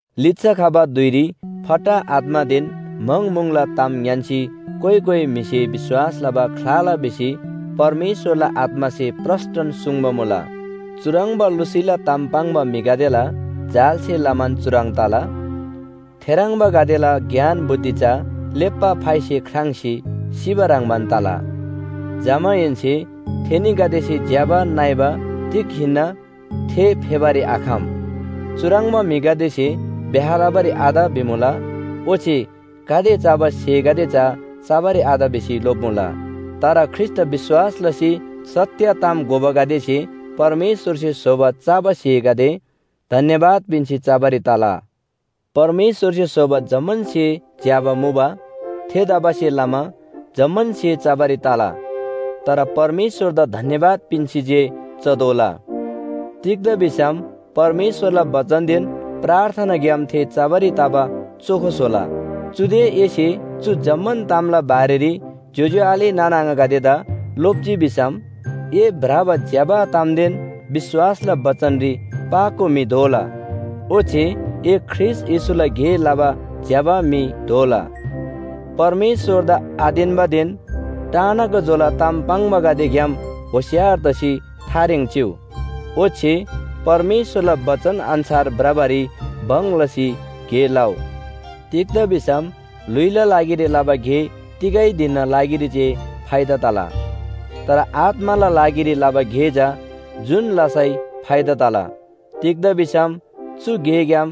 लिच्‍छा खबा धुइरी फट्टा आत्‍मादेन म्‍हङ म्‍हुङला ताम ङ्‌यान्‍सी कोइ कोइ म्‍हिसे विश्‍वास लबा ख्‍लाला भिसी परमेश्‍वरला आत्‍मासे प्रस्‍टन सुङ्बा मुला। चुह्रङ्बा लुसीला ताम पाङ्बा म्‍हिगदेला जालसे लमान चुह्रङ् तला, थेह्रङ्बागदेला ज्ञान बुद्धि चा लेप्‍बा फाइसे ख्राङ्‌सी सिबा ह्रङ्‌बान तला। जमाहेन्‍से थेनीगदेसे ज्‍यबा नइबा तिग हिन्‍ना थे फेबारी आखम। चुह्रङ्बा म्‍हिगदेसे ब्‍याह लबारी आत भिमुला, ओच्‍छे गाते चबा स्‍हेगदे चा चबारी आत भिसी लोप्‍मुला। तर ख्रीष्‍टदा विश्‍वास लसी सत्‍य ताम घोबागदेसे परमेश्‍वरसे स्‍होबा चबा स्‍हेगदे धन्‍यवाद पिन्‍सी चबारी तला। परमेश्‍वरसे स्‍होबा जम्‍मान स्‍हे ज्‍यबा मुबा। थेतबासेलमा जम्‍मान स्‍हे चबारी तला। तर परमेश्‍वरदा धन्‍यवाद पिन्‍सी जे चतोःला। तिग्‍दा भिसम परमेश्‍वरला बचनदेन प्रार्थनाग्‍याम थे चबारी तबा चोखो स्‍होला। चुदे एसे चु जम्‍मान तामला बारेरी ज्‍योज्‍यो आले नाना आङागदेदा लोप्‍जी भिसम, ए भ्रबा ज्‍यबा तामदेन विश्‍वासला बचनरी पाको म्‍हि दोला, ओच्‍छे ए ख्रीष्‍ट येशूला गे लबा ज्‍यबा म्‍हि दोला। परमेश्‍वरदा आतेन्‍बादेन टाना गा जोला ताम पाङ्बागदेग्‍याम होशियार तसी थारेङ चिउ, ओच्‍छे परमेश्‍वरला बचन अन्‍छार भ्रबारी भङ लसी गे लउ। तिग्‍दा भिसम ल्‍हुइला लागिरी लबा गे तिगै धिनना लागिरी जे फाइदा तला। तर आत्‍माला लागिरी लबा गे चा जुन लसै फाइदा तला। तिग्‍दा भिसम चु गेग्‍याम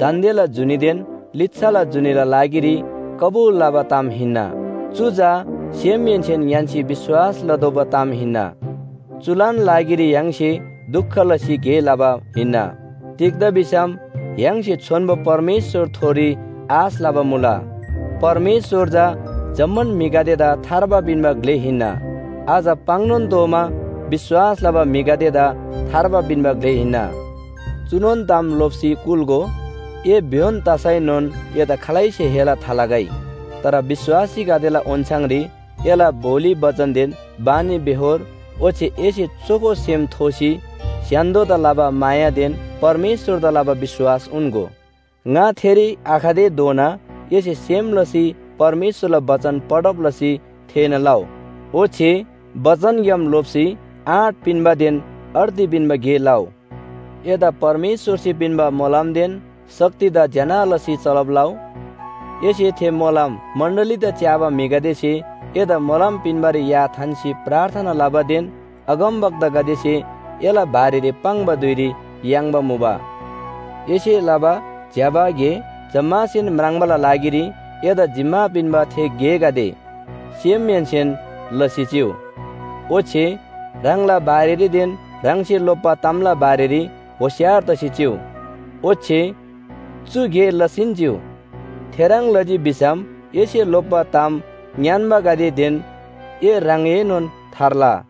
दान्‍देला जुनीदेन लिच्‍छाला जुनीला लागिरी कबुल लबा ताम हिन्‍ना। चु चा सेमहेन्‍सेन ङ्‌यान्‍सी विश्‍वास लतोःबा ताम हिन्‍ना। चुलान लागिरी य्‍हाङसे दुख लसी गे लबा हिन्‍ना। तिग्‍दा भिसम य्‍हाङसे छोन्‍बो परमेश्‍वरथोरी आश लबा मुला। परमेश्‍वर चा जम्‍मान म्‍हिगदेदा थार्बा पिन्‍बा ग्‍ले हिन्‍ना। अझ पाङ्‌नोन तोःमा विश्‍वास लबा म्‍हिगदेदा थार्बा पिन्‍बा ग्‍ले हिन्‍ना। चुनोन ताम लोप्‍सी कुल्‍गो। ए भ्‍योन तसैनोन एदा खालैसेन हेला थालगै। तर विश्‍वासीगदेला ओन्‍छाङरी एला बोली बचनदेन बानीबेहोर ओच्‍छे एसे चोखो सेम थोसी स्‍य्‍हान्‍दोदा लबा मायादेन परमेश्‍वरदा लबा विश्‍वास उन्‍गो। ङा थेरी आखतेधोना एसे सेम लसी परमेश्‍वरला बचन पढब लसी थेःना लउ, ओच्‍छे बचनग्‍याम लोप्‍सी आँट पिन्‍बादेन अर्ती पिन्‍बा गे लउ। एदा परमेश्‍वरसे पिन्‍बा मोलमदेन शक्तिदा ज्‍यना लसी चलब लउ। एसे थे मोलम मण्‍डलीदा च्‍याबा म्‍हिगदेसे एदा मोलम पिन्‍बारी या थान्‍सी प्रार्थना लबादेन अगमवक्तागदेसे एला बारेरी पाङ्बा धुइरी याङ्बा मुबा। एसे लबा ज्‍यबा गे जम्‍मासेन म्राङ्बाला लागिरी एदा जिम्‍मा पिन्‍बा थे गेगदे सेमहेन्‍सेन लसी चिउ। ओच्‍छे ह्राङला बारेरीदेन ह्राङसे लोप्‍बा तामला बारेरी होशियार तसी चिउ। ओच्‍छे चु गे लसीन चिउ। थेह्रङ् लजी भिसम एसे लोप्‍बा ताम ङ्‌यान्‍बागदेदेन ए ह्राङएनोन थार्ला।